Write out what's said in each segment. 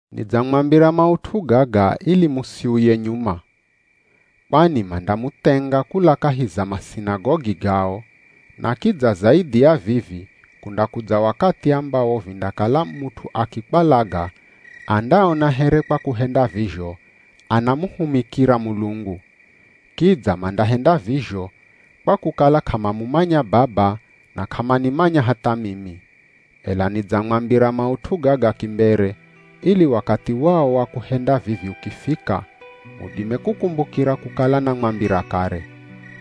“Nidzamwambira maut'u gaga ili musiuye nyuma. Kwani mandamuthenga kula kahi za masinagogi gao, na kidza zaidhi ya vivi kundakudza wakathi ambawo vindakala mut'u akikwalaga andaona here kwa kuhenda vizho anamuhumikira Mulungu. Kidza mandahenda vizho, kwa kukala k'amamumanya Baba na k'amanimanya hatha mimi. Ela nidzamwambira maut'u gaga kimbere ili wakathi wao wa kuhenda vivi ukifika mudime kukumbukira kukala namwambira kare.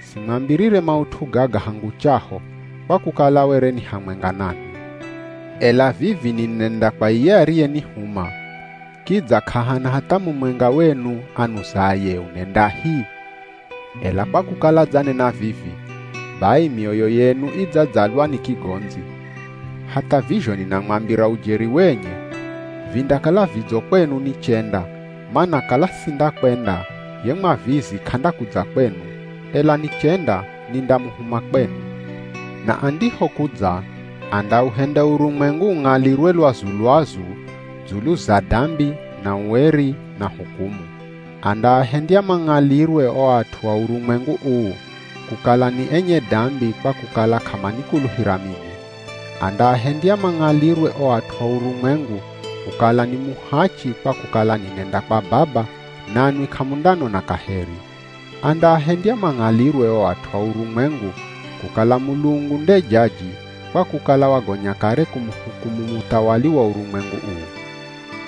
Simwambirire maut'u gaga hangu chaho, kwa kukala were ni hamwenga nanwi.” “Ela vivi ninenda kwa iye ariyenihuma, kidza k'ahana hatha mumwenga wenu anuzaye, ‘Unendahi?’ Ela kwa kukala dzanena vivi, bai mioyo yenu idzadzalwa ni kigondzi. Hatha vizho ninamwambira ujeri wenye, vindakala vidzo kwenu nichenda, mana kala sindakwenda ye Mwavizi k'andakudza kwenu, ela nichenda nindamuhuma kwenu. Na andihokudza andauhenda urumwengu ung'alirwe lwazu-lwazu dzulu za dambi na ueri na hukumu. Andaahendya mang'alirwe o at'u a urumwengu uu, kukala ni enye dambi kwa kukala k'amanikuluhira mimi. Andaahendya mang'alirwe o at'u a urumwengu kukala ni muhachi kwa kukala ninenda kwa Baba nanwi k'amundanona kaheri. Andaahendya mang'alirwe o at'u a urumwengu kukala Mulungu nde jaji kwa kukala wagonya kare kumuhukumu muthawali wa urumwengu uu.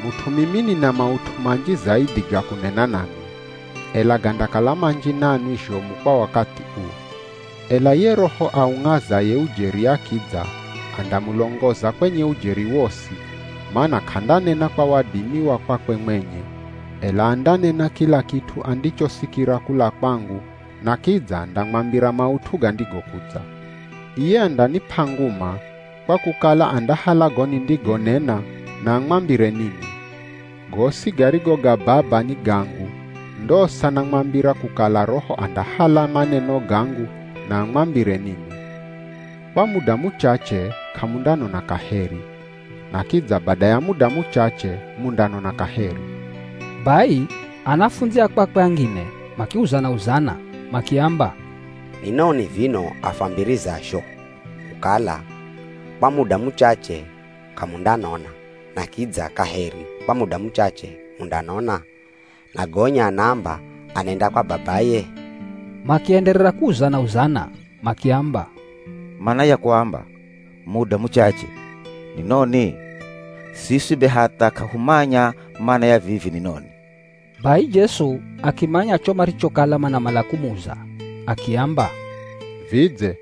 “Mut'u mimi nina maut'u manji zaidhi ga kunena nanwi, ela gandakala manji nanwi zhomu kwa wakathi uu. Ela ye Roho aung'azaye ujeri akidza andamulongoza kwenye ujeri wosi, mana k'andanena kwa wadimi wa kwakwe mwenye, ela andanena kila kit'u andichosikira kula kwangu na kidza andamwambira maut'u gandigokudza. Iye andanip'a nguma, kwa kukala andahala go nindigonena na amwambire ninwi. Gosi garigo ga Baba ni gangu, ndosa namwambira kukala Roho andahala maneno gangu na amwambire ninwi.” “Kwa muda muchache k'amundanona kaheri, na kidza bada ya muda muchache mundanona kaheri.” Bai anafundzi a kwakwe angine makiuzana-uzana, makiamba, “Ni noni vino afwambirazho kukala, ‘Kwa muda muchache k'amundanona na kidza kaheri kwa muda muchache mundanona,’ na gonya anaamba anenda kwa Babaye?” Makienderera kuuzana-uzana, makiamba, “Mana ya kuamba, ‘Muda muchache’ ni noni? Siswi be hatha k'ahumanya mana ya vivi ni noni.” Bai Jesu akimanya cho marichokala manamala kumuza akiamba, “Vidze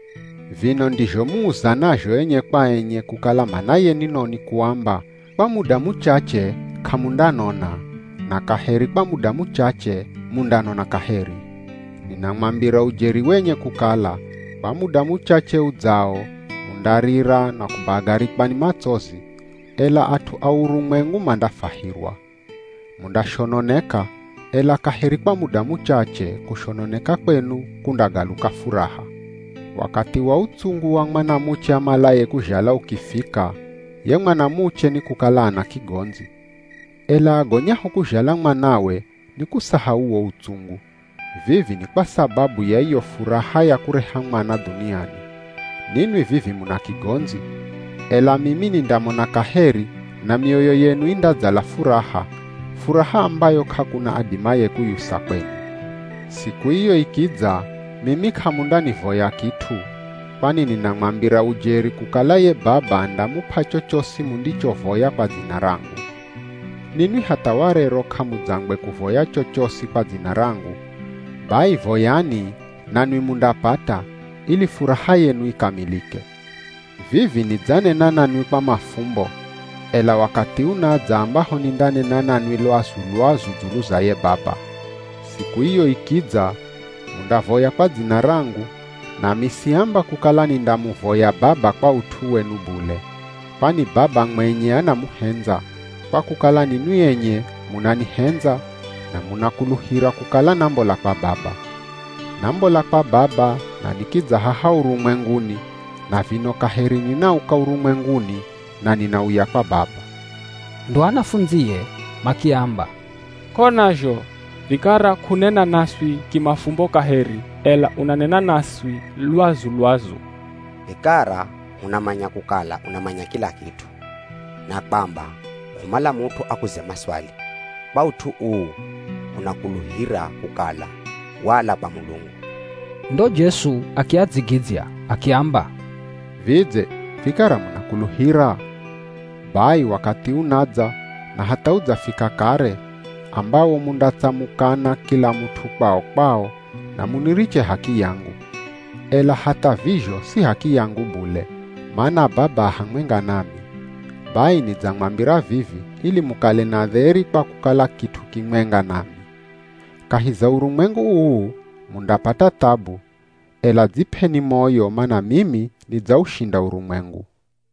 vino ndizho muuzanazho enye kwa enye kukala manaye ni noni kuamba, ‘Kwa muda muchache k'amundanona na kaheri kwa muda muchache mundanona kaheri?’ Ninamwambira ujeri wenye kukala kwa muda muchache udzao mundarira na kubagarikwa ni matsozi, ela at'u a urumwengu mandafwahirwa. Mundashononeka, ela kaheri kwa muda muchache kushononeka kwenu, kundagaluka furaha. Wakathi wa utsungu wa mwanamuche amalaye kuzhala ukifika, ye mwanamuche nikukala ana kigondzi. Ela agonyaho kuzhala mwanawe ni kusahau wo utsungu. Vivi ni kwa sababu ya iyo furaha ya kureha mwana dhuniani. Ninwi vivi muna kigondzi, ela mimi nindamona kaheri na mioyo yenu indadzala furaha, furaha ambayo k'akuna adimaye kuyusa kwenu. Siku iyo ikidza mimi k'amundanivoya kit'u, kwani ninamwambira ujeri kukala ye Baba andamup'a chochosi mundichovoya kwa dzina rangu. Ninwi hatha warero k'amudzangwe kuvoya chochosi kwa dzina rangu, bai voyani nanwi mundapata ili furaha yenu ikamilike. Vivi nidzanena nanwi kwa mafumbo, ela wakathi unadza ambaho nindanena nanwi, lwazu-lwazu dzulu za ye Baba. Siku iyo ikidza mundavoya kwa dzina rangu, nami siamba kukala nindamuvoya Baba kwa ut'u wenu bule. Kwani Baba mwenye anamuhendza, kwa kukala ninwi enye munanihendza na munakuluhira kukala nambola kwa Baba. Nambola kwa Baba na nikidza haha urumwenguni na vino kaheri ninauka urumwenguni, na ninauya kwa Baba.” Ndo anafundzie makiamba, “K'ona zho, vikara k'unena naswi kimafumbo kaheri, ela unanena naswi lwazu-lwazu. Vikara hunamanya kukala unamanya kila kit'u, na kwamba k'umala mut'u akuze maswali, kwa ut'u uu hunakuluhira kukala wala kwa Mulungu.” Ndo Jesu akiadzigidzya akiamba, “Vidze vikara munakuluhira? Bai wakathi unadza, na hatha udzafika kare, ambawo mundatsamukana kila mut'u kwao-kwao na muniriche h'akiyangu. Ela hatha vizho si h'akiyangu bule, mana Baba a hamwenga nami. Bai nidzamwambira vivi ili mukale na dheri kwa kukala kit'u kimwenga nami. Kahi za urumwengu uu, mundapata thabu, ela dzip'eni moyo mana mimi nidzaushinda urumwengu.”